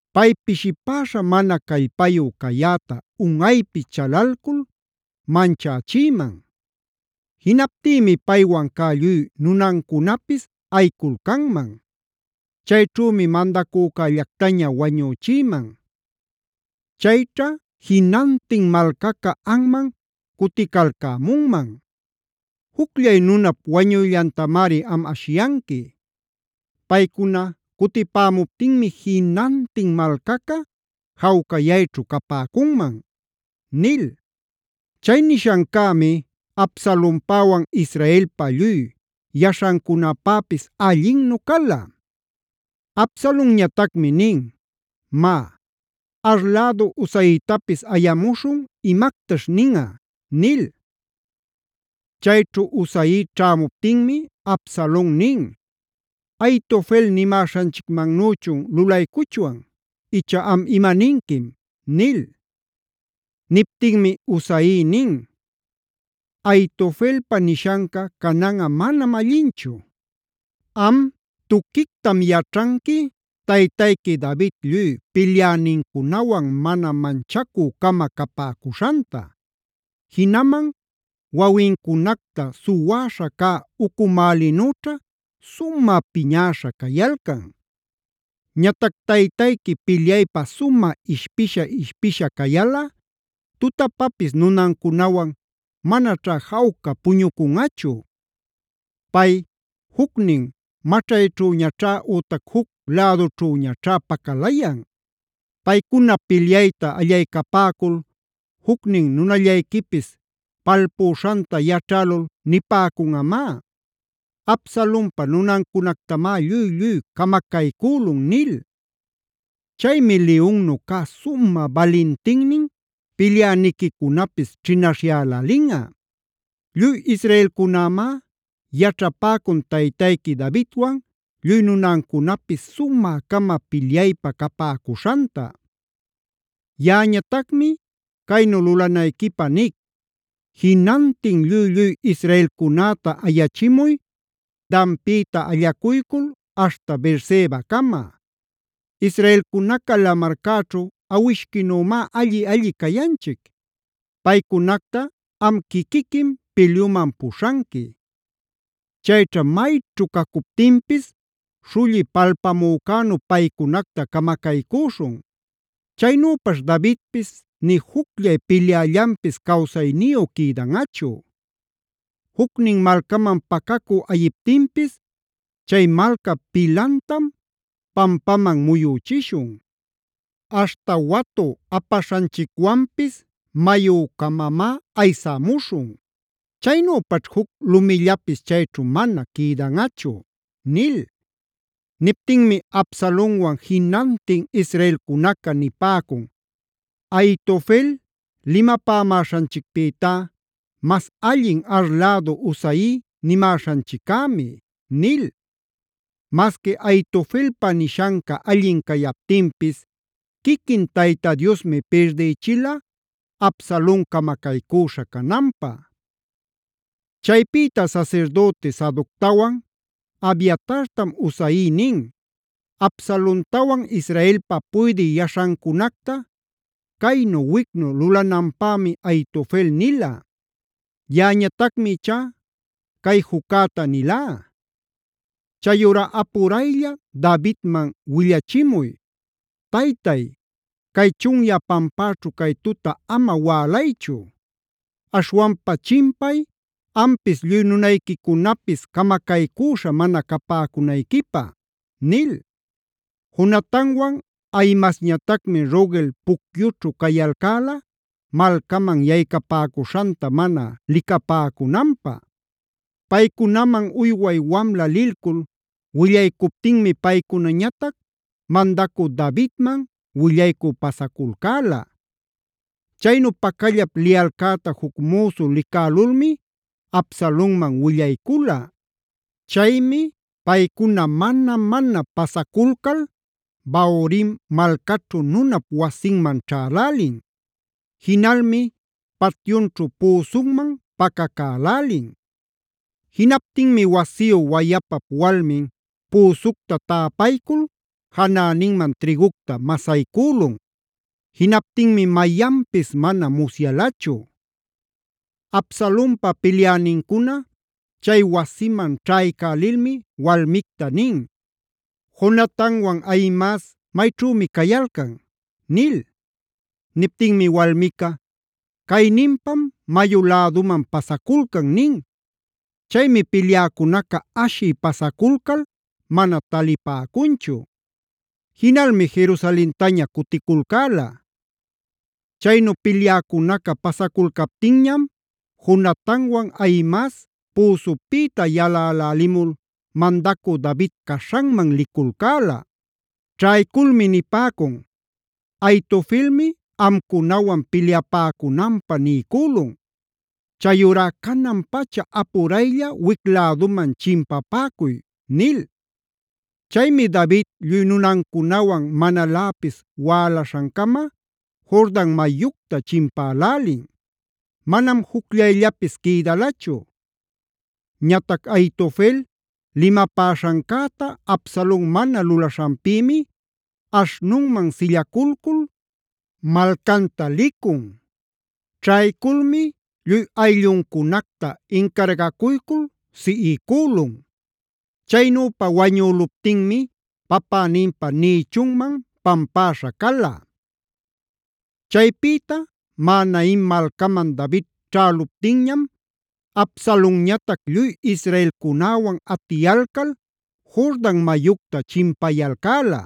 Pay pishipäśha mana callpayu cayäta unꞌaypi chalalcul manchächïman. Jinaptïmi paywan cä lluy nunancunapis ayiculcanman. Chayćhümi mandacücällactaña wañüchïman. Chayćha jinantin malcaca anman cuticalcämunman. Jucllay nunap wañuyllantamari am ashiyanqui. Paycuna cutipämuptinmi jinantin malcaca jawcayayćhu capäcunman” nil. Chay nishancämi Absalonpäwan Israelpa lluy yaśhancunapäpis allinnu cala. Absalonñatacmi nin: “Má, Ar lädu Husaitapis ayamuśhun, imactaśh ninꞌa” nil. Chayćhu Husai ćhämuptinmi Absalon nin: “¿Ahitofel nimäśhanchicmannüchun lulaycuchwan? icha, ¿am imaninquim?” nil. Niptinmi Husai nin: “Ahitofelpa nishanca cananꞌa manam allinchu. Am tuquictam yaćhanqui taytayqui David lluy pilyänincunawan mana manchacü-cama capäcuśhanta. Jinaman wawincunacta suwäśha cä ucumälinüćha sumä piñäśha cayalcan. Ñatac taytayqui pilyaypä sumä ishpisha-ishpisha cayalꞌa tutapapis nunancunawan manaćhá jawca puñucunꞌachu. Pay jucnin maćhayćhüñaćhá ütac juc lädućhüñaćhá pacalayan. Paycuna pilyayta allaycapäcul jucnin nunallayquipis palpüśhanta yaćhälul nipäcunꞌamá: ‘Absalonpa nunancunactamá lluy-lluy camacaycülun’ nil. Chaymi liyunnu cä sumä balintinnin pilyäniquicunapis chinaśhyälälinꞌa. Lluy israelcunämá yaćhapäcun taytayqui Davidwan lluy nunancunapis sumä-cama pilyaypä capäcuśhanta. Yaꞌañatacmi caynu lulanayquipä nic: Jinantin lluy-lluy israelcunäta ayachimuy Danpïta allacuycul aśhta Beersebacama. Israelcunaca lamarcäćhu awishquinümi alli-alli cayanchic. Paycunacta am quiquiquim pilyuman puśhanqui. Chayćha mayćhu cacuptinpis śhulli palpamücänu paycunacta camacaycüśhun. Chaynüpaćh Davidpis nï jucllay pilyällanpis cawsayniyu quïdanꞌachu. Jucnin malcaman pacacü ayiptinpis, chay malcap pilantam pampaman muyüchishun; aśhta watu apaśhanchicwanpis mayü-camamá aysämuśhun. Chaynüpaćh juc lumillapis chayćhu mana quïdanꞌachu” nil. Niptinmi Absalonwan jinantin israelcunaca nipäcun: “Ahitofel limapamäśhanchicpïtá mas allin Ar lädu Husai nimäśhanchiccämi” nil. Masqui Ahitofelpa nishanca allin cayaptinpis quiquin Tayta Diosmi pirdïchila Absalon camacaycüśha cananpä. Chaypïta sasirdüti Sadoctawan Abiatartam Husai nin: “Absalontawan Israelpa puydï yaśhancunacta caynu-wicnu lulananpämi Ahitofel nila. Yaꞌañatacmi ichá cay juccäta nilá. Chayurá apuraylla Davidman willachimuy: ‘Taytay, cay chunyä pampäćhu cay tuta ama wälaychu. Aśhwanpa chimpay ampis lluy nunayquicunapis camacaycüśha mana capäcunayquipä’” nil. Jonatanwan Ahimaasñatacmi Rogel pucyućhu cayalcäla, malcaman yaycapäcuśhanta mana licapäcunanpä. Paycunaman uyway wamla lilcul willaycuptinmi paycunañatac mandacü Davidman willaycü pasaculcäla. Chaynu pacallap liyalcäta juc müsu licälulmi Absalonman willaycula. Chaymi paycuna mana-mana pasaculcal Bahurim malcaćhu nunap wasinman ćhälälin. Jinalmi patyunćhu püsunman pacacälälin. Jinaptinmi wasiyu wayapap walmin püsucta täpaycul janäninman trïgucta masaycülun. Jinaptinmi mayanpis mana musyalachu. Absalonpa pilyänincuna chay wasiman ćhaycälilmi walmicta nin: “¿Jonatanwan Ahimaas mayćhümi cayalcan?” nil. Niptinmi walmica: “Cayninpam mayu läduman pasaculcan” nin. Chaymi pilyäcunaca ashï pasaculcal mana talipäcunchu. Jinalmi Jerusalentaña cuticulcäla. Chaynu pilyäcunaca pasaculcaptinñam Jonatanwan Ahimaas püsupïta yalälälimul mandacü David caśhanman liculcäla. Ćhayculmi nipäcun: “Ahitofelmi amcunawan pilyapäcunanpä niycülun. Chayurá canan-pacha apuraylla wic-läduman chimpapäcuy” nil. Chaymi David lluy nunancunawan manaläpis wälaśhancama Jordan mayucta chimpälälin. Manam jucllayllapis quïdalachu. Ñatac Ahitofel limapäśhancäta Absalon mana lulaśhanpïmi aśhnunman sillaculcul malcanta licun. Ćhayculmi lluy aylluncunacta incargacuycul siꞌicülun. Chaynüpa wañüluptinmi papäninpa nïchunman pampäśha cala. Chaypïta Mahanaim malcaman David ćhäluptinñam Absalonñatac lluy israelcunäwan atiyalcal Jordan mayucta chimpayalcäla.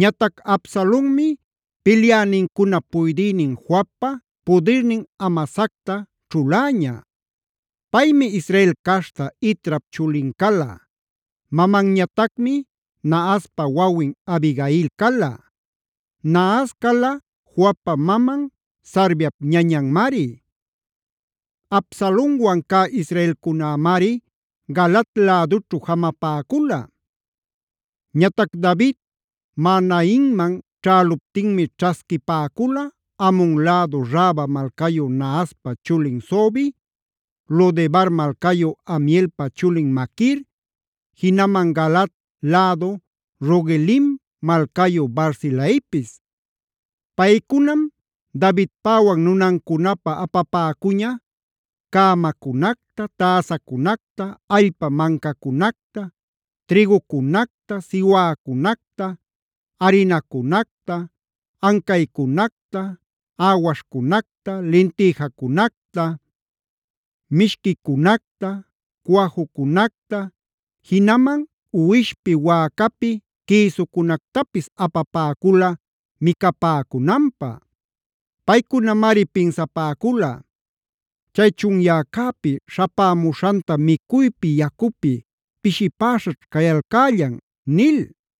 Ñatac Absalonmi pilyänincunap puydïnin Joabpa pudirnin Amasacta ćhuläña. Paymi Israel caśhta Itrap chulin cala; mamanñatacmi Nahaspa wawin Abigail cala. Nahas cala Joabpa maman Sarviap ñañanmari. Absalonwan cä israelcunämari Galaad lädućhu jamapäcula. Ñatac David Mahanaimman ćhäluptinmi ćhasquipäcula Amon lädu Raba malcayu Nahaspa chulin Sobi, Lo-debar malcayu Amielpa chulin Maquir, jinaman Galaad lädu Rogelim malcayu Barzilaipis. Paycunam Davidpäwan nunancunapä apapäcuña: cämacunacta, täsacunacta, allpa mancacunacta, trïgucunacta, siwäcunacta, arinacunacta, ancaycunacta, äwaśhcunacta, lintïjacunacta, mishquicunacta, cuajucunacta; jinaman uwishpi, wäcapi quïsucunactapis apapäcula micapäcunanpä. Paycunamari pinsapäcula: “Chay chunyäcäpi śhapämuśhanta micuypi, yacupi, pishipäśhaćh cayalcällan” nil.